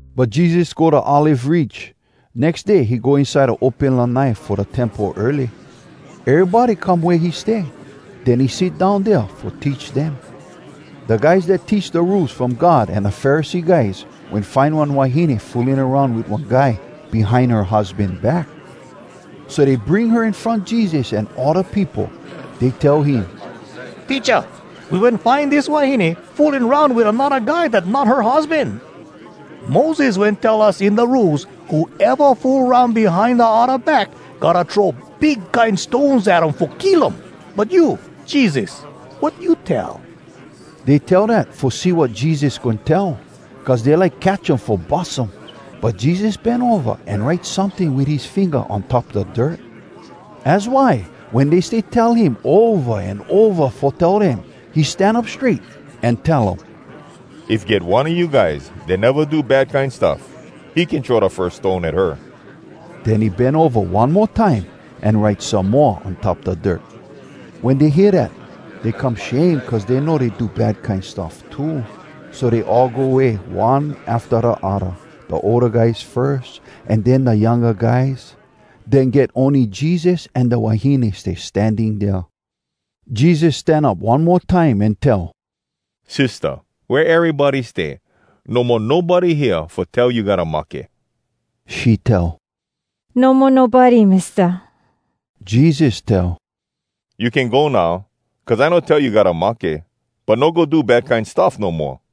But Jesus go da Olive Ridge. Nex day he go inside da open lanai fo da Temple early. Erybody come wea he stay. Den he sit down dea fo teach dem. Da guys dat teach da Rules From God an da Pharisee guys wen find one wahine fooling aroun wit one guy behind her husban back. So dey bring her in front Jesus an all da peopo. Dey tell him, “Teacha, we wen find dis wahine fooling aroun wit anodda guy dat not her husban! Moses wen tell us in da Rules, ‘Whoeva fool aroun behind da odda back, gotta throw big kine stones at um fo kill um.’ But you, Jesus, wat you tell?” Dey tell dat fo see wat Jesus goin tell, cuz dey like catch um fo bus um. But Jesus bend ova an write someting wit his finga on top da dirt. Az why wen dey stay tell him ova an ova fo tell dem, he stan up strait an tell um, “If get one a you guys dat neva do bad kine stuff, he can throw da firs stone at her.” Den he bend ova one mo time, an write some mo on top da dirt. Wen dey hear dat, dey come shame cuz dey know dey do bad kine stuff too. So dey all go way, one afta da odda, da older guys firs, an den da younga guys. Den get ony Jesus an da wahine stay standing dea. Jesus stan up one mo time an tell, “Sistah, wea erybody stay? No mo nobody hea fo tell you gotta mahke?” She tell, “No mo nobody, Mista.” Jesus tell, “You can go now, cuz I no tell you gotta mahke. But no go do bad kine stuff no moa.”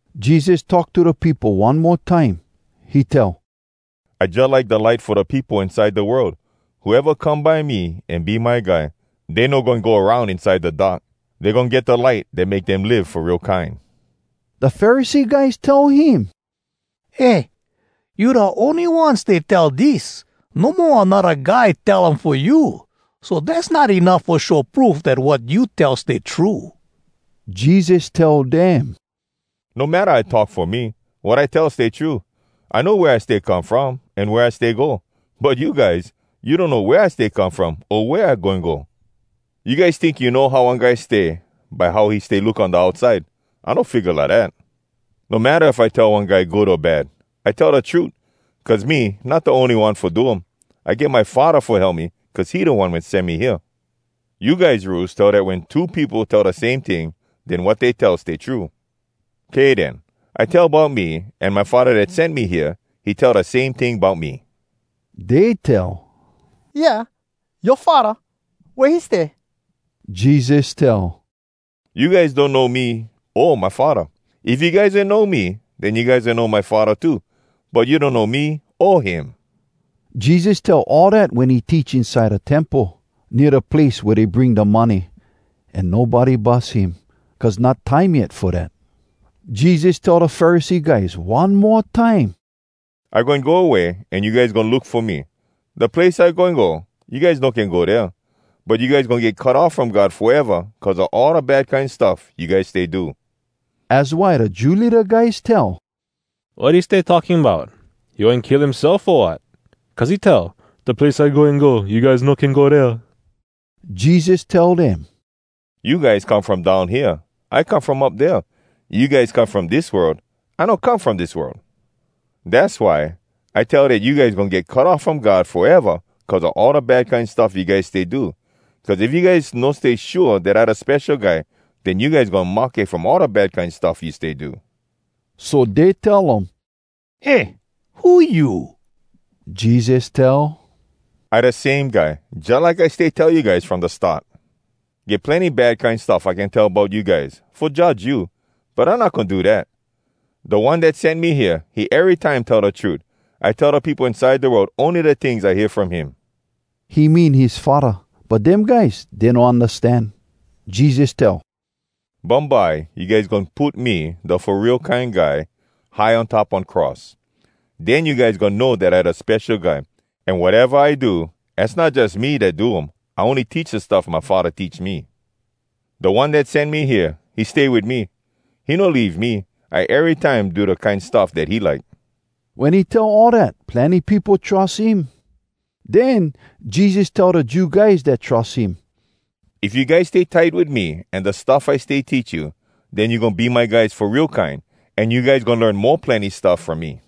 Jesus talk to da peopo one mo time. He tell, “I jalike da light fo da peopo inside da world. Whoeva come by me an be my guy, dey no goin go aroun inside da dark. Dey goin get da light dat make dem live fo real kine.” Da Pharisee guys tell him, “Eh! You da ony one stay tell dis. No mo anodda guy tell um fo you. So dass not enuff fo show proof dat wat you tell stay true.” Jesus tell dem, “No matta I talk fo me, wat I tell stay true. I know wea I stay come from, an wea I stay go. But you guys, you donno wea I stay come from, o wea I goin go. You guys tink you know how one guy stay by how he stay look on da outside. I no figga lidat. No matta if I tell one guy good o bad, I tell da trut, cuz me not da ony one fo do um. I get my Faddah fo help me, cuz he da One wen sen me hea. You guys Rules tell dat wen two peopo tell da same ting, den wat dey tell stay true. Kay den. I tell bout me, an my Faddah dat sen me hea, he tell da same ting bout me.” Dey tell, “Yeah? Yoa faddah, wea he stay?” Jesus tell, “You guys donno me o my Faddah. If you guys wen know me, den you guys wen know my Faddah too. But you donno me o him.” Jesus tell all dat wen he teach inside da Temple, nea da place wea dey bring da money. An nobody bus him, cuz not time yet fo dat. Jesus tell da Pharisee guys one mo time, “I goin go away, an you guys goin look fo me. Da place I goin go, you guys no can go dea. But you guys goin get cut off from God foeva cuz a all da bad kine stuff you guys stay do.” Az why da Jew leada guys tell, “Wat he stay talking bout? He goin kill himself, o wat? Cuz he tell, ‘Da place I goin go, you guys no can go dea.’” Jesus tell dem, “You guys come from down hea, I come from up dea. You guys come from dis world, I no come from dis world. Dass why I tell dat you guys goin get cut off from God foeva cuz a all da bad kine stuff you guys stay do. Cuz if you guys no stay shua dat I da Spesho Guy, den you guys goin mahke from all da bad kine stuff you stay do.” So dey tell um, “Eh, who you?” Jesus tell, “I da same guy, jalike I stay tell you guys from da start. Get plenny bad kine stuff I can tell bout you guys, fo judge you. But I not goin do dat. Da One dat sen me hea, he erytime tell da trut. I tell da peopo inside da world ony da tings I hear from him.” (He mean his Faddah. But dem guys, dey no undastan.) Jesus tell, “Bumbye you guys goin put me, da Fo Real Kine Guy, high on top one cross. Den you guys goin know dat I da Spesho Guy, an wateva I do, az not jus me dat do um. I ony teach da stuff my Faddah teach me. Da One dat sen me hea, he stay wit me. He no leave me. I erytime do da kine stuff dat he like.” Wen he tell all dat, plenny peopo trus him. Den Jesus tell da Jew guys dat trus him, “If you guys stay tight wit me an da stuff I stay teach you, den you goin be my guys fo real kine, an you guys goin learn mo plenny stuff from me.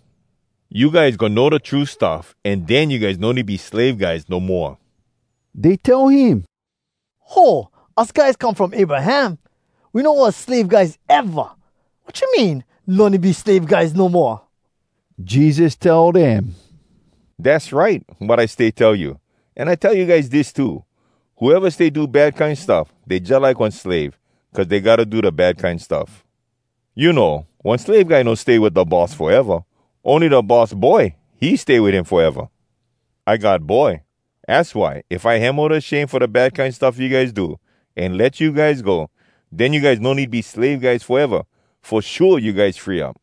You guys goin know da true stuff, an den you guys no need be slave guys no moa.” Dey tell him, “Ho! Us guys come from Abraham! We no was slave guys eva! Wat you mean, ‘No need be slave guys no moa’?” Jesus tell dem, “Dass right, wat I stay tell you! An I tell you guys dis too: Whoeva stay do bad kine stuff, dey jalike one slave, cuz dey gotta do da bad kine stuff. You know, one slave guy no stay wit da boss foeva. Ony da boss boy, he stay wit him foeva. I God Boy, az why if I hemo da shame fo da bad kine stuff you guys do, an let you guys go, den you guys no need be slave guys foeva. Fo shua you guys free up!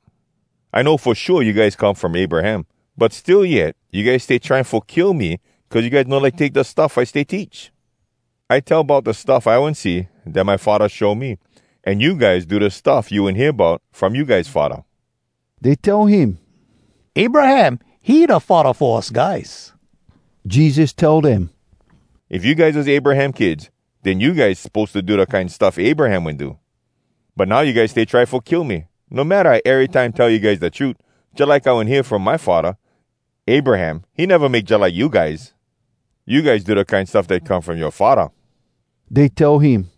“I know fo shua you guys come from Abraham. But still yet, you guys stay trying fo kill me, cuz you guys no like take da stuff I stay teach. I tell bout da stuff I wen see, dat my Faddah show me, an you guys do da stuff you wen hear bout from you guys faddah.” Dey tell him, “Abraham, he da faddah fo us guys!” Jesus tell dem, “If you guys was Abraham kids, den you guys suppose to do da kine stuff Abraham wen do. But now you guys stay try fo kill me, no matta I erytime tell you guys da trut, jalike I wen hear um from my Faddah. Abraham, he neva make jalike you guys! You guys do da kine stuff dat come from yoa faddah!” Dey tell him,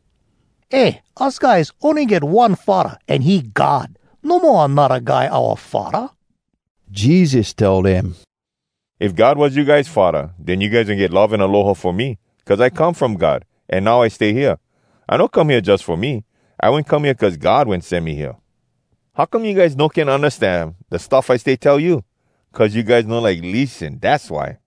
“Eh, us guys ony get one faddah, an he God! No mo anodda guy oua faddah!” Jesus tell dem, “If God was you guys faddah, den you guys wen get love an aloha fo me, cuz I come from God, an now I stay hea. I no come hea jus fo me. I wen come hea cuz God wen sen me hea. How come you guys no can undastan da stuff I stay tell you? Cuz you guys no like lissen, dass why!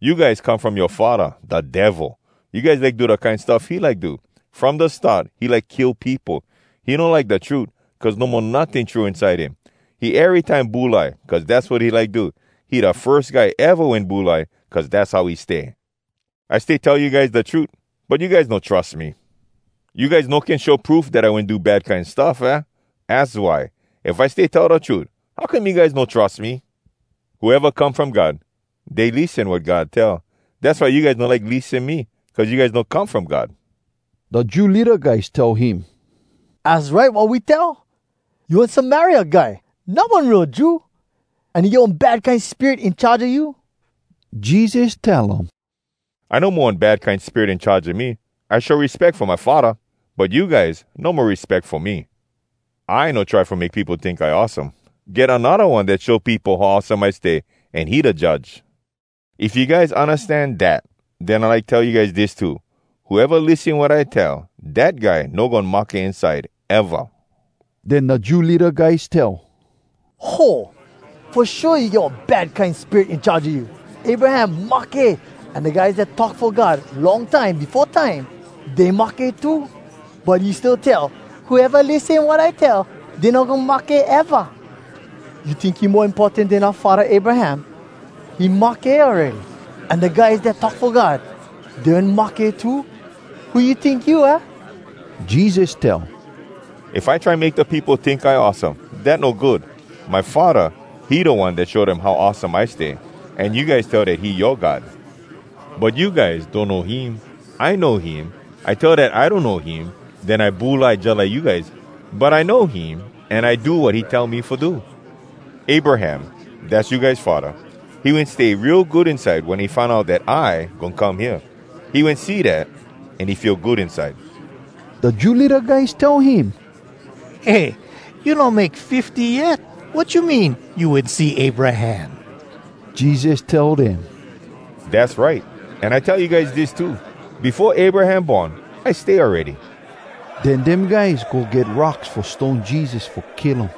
“You guys come from yoa faddah, da Devil! You guys like do da kine stuff he like do. From da start, he like kill peopo. He no like da trut, cuz no mo notting true inside him. He erytime bulai, cuz dass wat he like do. He da firs guy eva wen bulai, cuz dass how he stay. I stay tell you guys da trut, but you guys no trus me. You guys no can show proof dat I wen do bad kine stuff, aah? Az why, if I stay tell da trut, how come you guys no trus me? “Whoeva come from God, dey lissen wat God tell. Dass why you guys no like lissen me, cuz you guys no come from God.” Da Jew leada guys tell him, “Az right wat we tell! You one Samaria guy, not one real Jew, an you get one bad kine spirit in charge a you!” Jesus tell um, “I no mo one bad kine spirit in charge a me. I show respeck fo my Faddah. But you guys no mo respeck fo me. I no try fo make peopo tink I awesome. Get anodda One dat show peopo how awesome I stay, an he da judge. “If you guys undastan dat, den I like tell you guys dis too: Whoeva lissen wat I tell, dat guy no goin mahke inside, eva!” Den da Jew leada guys tell, “Ho! Fo shua you get one bad kine spirit in charge a you! Abraham mahke, an da guys dat talk fo God long time befo time, dey mahke too. But you still tell, ‘Whoeva lissen wat I tell, dey no goin mahke, eva.’ You tink you mo importan den oua faddah Abraham? He mahke awready. An da guys dat talk fo God, dey wen mahke too. Who you tink you, hah?” Jesus tell, “If I try make da peopo tink I awesome, dat no good. My Faddah, he da One dat show dem how awesome I stay. An you guys tell dat he yoa God. But you guys donno him. I know him. If I tell dat I donno him, den I bulai, jalike you guys. But I know him, an I do wat he tell me fo do. Abraham, dass you guys faddah. He wen stay real good inside wen he find out dat I goin come hea. He wen see dat, an he feel good inside.” Da Jew leada guys tell him, “Eh! you no make fifty yet! Wat you mean, you wen see Abraham?” Jesus tell dem, “Dass right! An I tell you guys dis too: Befo Abraham born, I stay awready.” Den dem guys go get rocks fo stone Jesus fo kill um.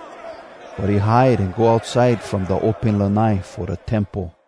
But he hide an go outside from da open lanai fo da Temple.